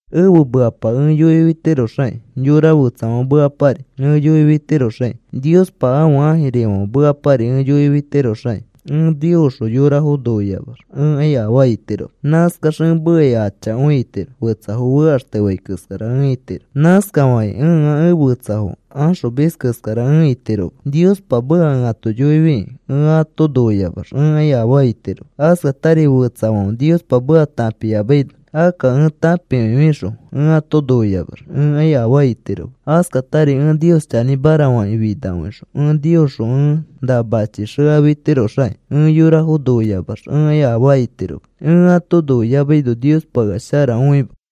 Ẽfe mekapa ẽ yoifitiroxakĩ, yora fetsafãfe mekapari ẽ yoifitiroxakĩ, Niospa ãfe ãjirifãfe mekapari ẽ yoifitiroxakĩ ẽ Niosxõ yorafo noiyamax ẽkai afaa itiroma. Nãskax ẽ mekai achakõi itiro, fetsafo fekaxtefai keskara ẽ itiro. Nãskafakĩ ẽa ẽ fetsafo axomis keskara ẽ itiroma. Niospa meka ẽ ato yoifikĩ ẽ ato noiyamax ẽkai afaa itiroma. Askatari fetsafãfe Niospa meka tãpiyamaino akka ẽ tãpikõifixõ ẽ ato noiyamax ẽkai afaa itiroma. Askatari ẽ Nios chanĩmara fakĩ finakõixõ ẽ Niosxõ ẽ nã machi xekafitiroxaki ẽ yorafo noiyamax ẽkai afaa itiroma. Ẽ ato noiyamaino Niospa ea shara õima.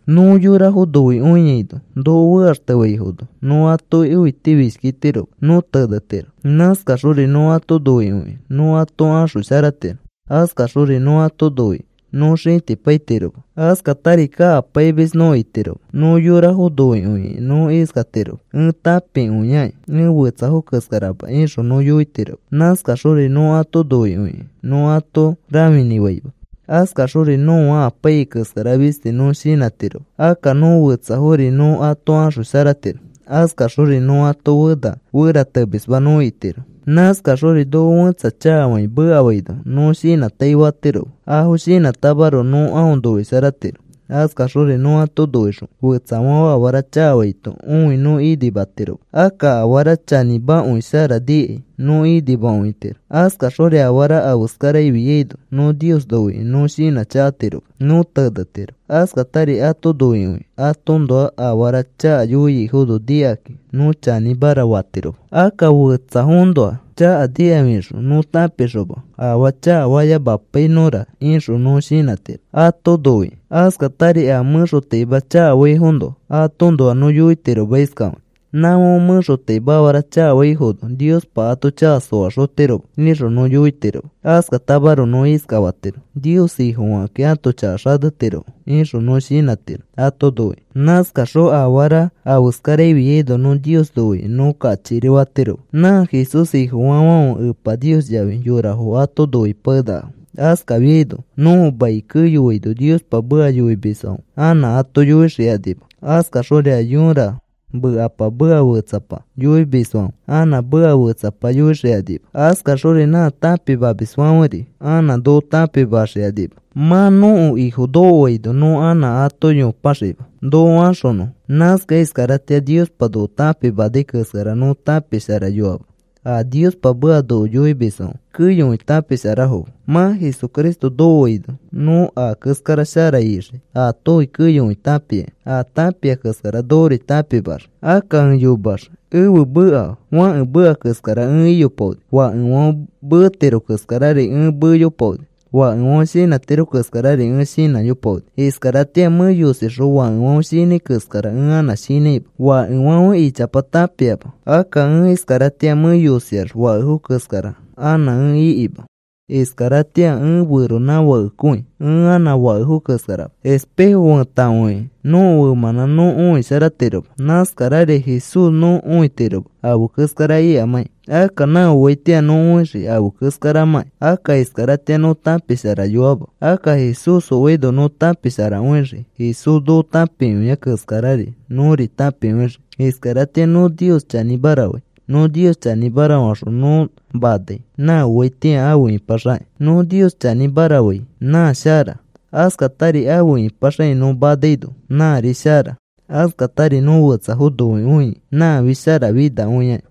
Nõ yorafo noikõiaino noko fekaxtefaifono nõ atoki õitifishkitiroma, nõ tenetiro. Nãskaxori nõ ato noikõikĩ nõ ato axosharatiro. Askaxori nõ ato noikĩ nõ xĩtipaitiroma. Askatari kakapaimis nõ itiroma. Nõ yorafo noikõikĩ nõ iskatiroma: “Ẽ tãpikõiaki. Ẽ fetsafo keskarama,” ixõ nõ yoitiroma. Nãskaxori nõ ato noikõikĩ nõ ato rãfinĩfaima. Askaxori nõa apaiyai keskara fistis nõ shinãtiroma. Akka nõ fetsafori nõ ato axosharatiro. Askaxori nõ ato fena feratemisma nõ itiro. Nãskaxori noko fẽtsa chakafakĩ mekafaino nõ shinãtaifatiroma. Afo shinãtamaroko nõ aõ noisharatiro. Askaxori nõ ato noixõ fetsafãfe afara chakafaito õi nõ inimatiroma. Akka afara chanĩmakõi shara nikai nõ inimakõitiro. Askaxori afara afe keskararafiaino nõ Nios noikĩ nõ shinãchakatiroma. Nõ tenetiro. Askatari ato noikõikĩ atoõnoa afara chaka yoiaifono nikakĩ nõ chanĩmara fatiroma. Akka fetsafoõnoa chaka nikafixõ nõ tãpixoma, “Afaa chakafayamapainõfora,” ixõ nõ shinãtiro ato noikĩ. Askatari a mẽxotaima chakafaifoõnoa atoõnoa nõ yoitiroma iskafakĩ: “Nãfãfe mẽxotaima afara chakafaifono Niospa ato chaka soaxotiroma,” ixõ nõ yoitiroma. Askatamaroko nõ iskafatiro: “Nios Ifofakakĩ ãto chaka xatetirofo,” ixõ nõ shinãtiro ato noikĩ. Nãskaxori afara afe keskararafiaino nõ Nios noikĩ nõ kachikiri fatiroma. Nã Jesús Ifofaafãfe Epa Nios yafi yorafo ato noipakenakafo. Askafiaino nõko mai keyoaino Niospa meka yoimisfãfe anã ato yoixikanima. Askaxori a yõra mekapama meka fetsapa yoimisfãfe anã meka fetsapa yoixikanima. Askaxori nã tãpimamisfãferi anã noko tãpimaxikanima. Mã nõko Ifo nokoaino nõ anã ato yopaxiima noko axonõfo. Nãskakẽ iskaratĩa Niospa noko tãpimanai keskara nõ tãpisharayoama. A Niospa meka noko yoimisfãfe keyokõi tãpisharafoma. Mã Jesucristo nokoaino nõ a keskara shara ixii. Aatofi keyokõi tãpiakĩ. A tãpia keskara nokori tãpimaxii. Akka ẽ yomeax ẽfe meka fãke meka keskara ẽ iyopaoni. Fakefãfe metiro keskarari ẽ meyopaoni. Fakefãfe shinãtiro keskarari ẽ shinãyopaoni. Iskaratĩa mẽ yosixõ fakefãfe shinãi keskara ẽ anã shinãima. Fakefãfe ichapa tãpiama. Akka ẽ iskaratĩa mẽ yosiax fakefo keskara anã ẽ ikima. Iskaratĩa ẽ feronãfakekõi ẽ anã fakefo keskarama. Feisiti fetakõikẽ nõko femãnã nõ õisharatiroma. Nãskarari Jesús nõ õitiroma afe keskara ikamãkĩ. Akka nã oaitĩa nõ õixii afe keskaramãkĩ. Akka iskaratĩa nõ tãpisharayoama. Akka Jesús oaino nõ tãpisharakõixii. Jesús noko tãpikõia keskarari nõri tãpikõixii. Iskaratĩa nõ Nios chanĩmara fai. Nõ Nios chanĩmara faxõ nõ manai nã oaitĩa afe ipaxakĩ. Nõ Nios chanĩmara fai nã shara. Askatari afe ipaxakĩ nõ manaino nãri shara. Askatari nõ fetsafo noikõia nãfi sharafinakõiaki.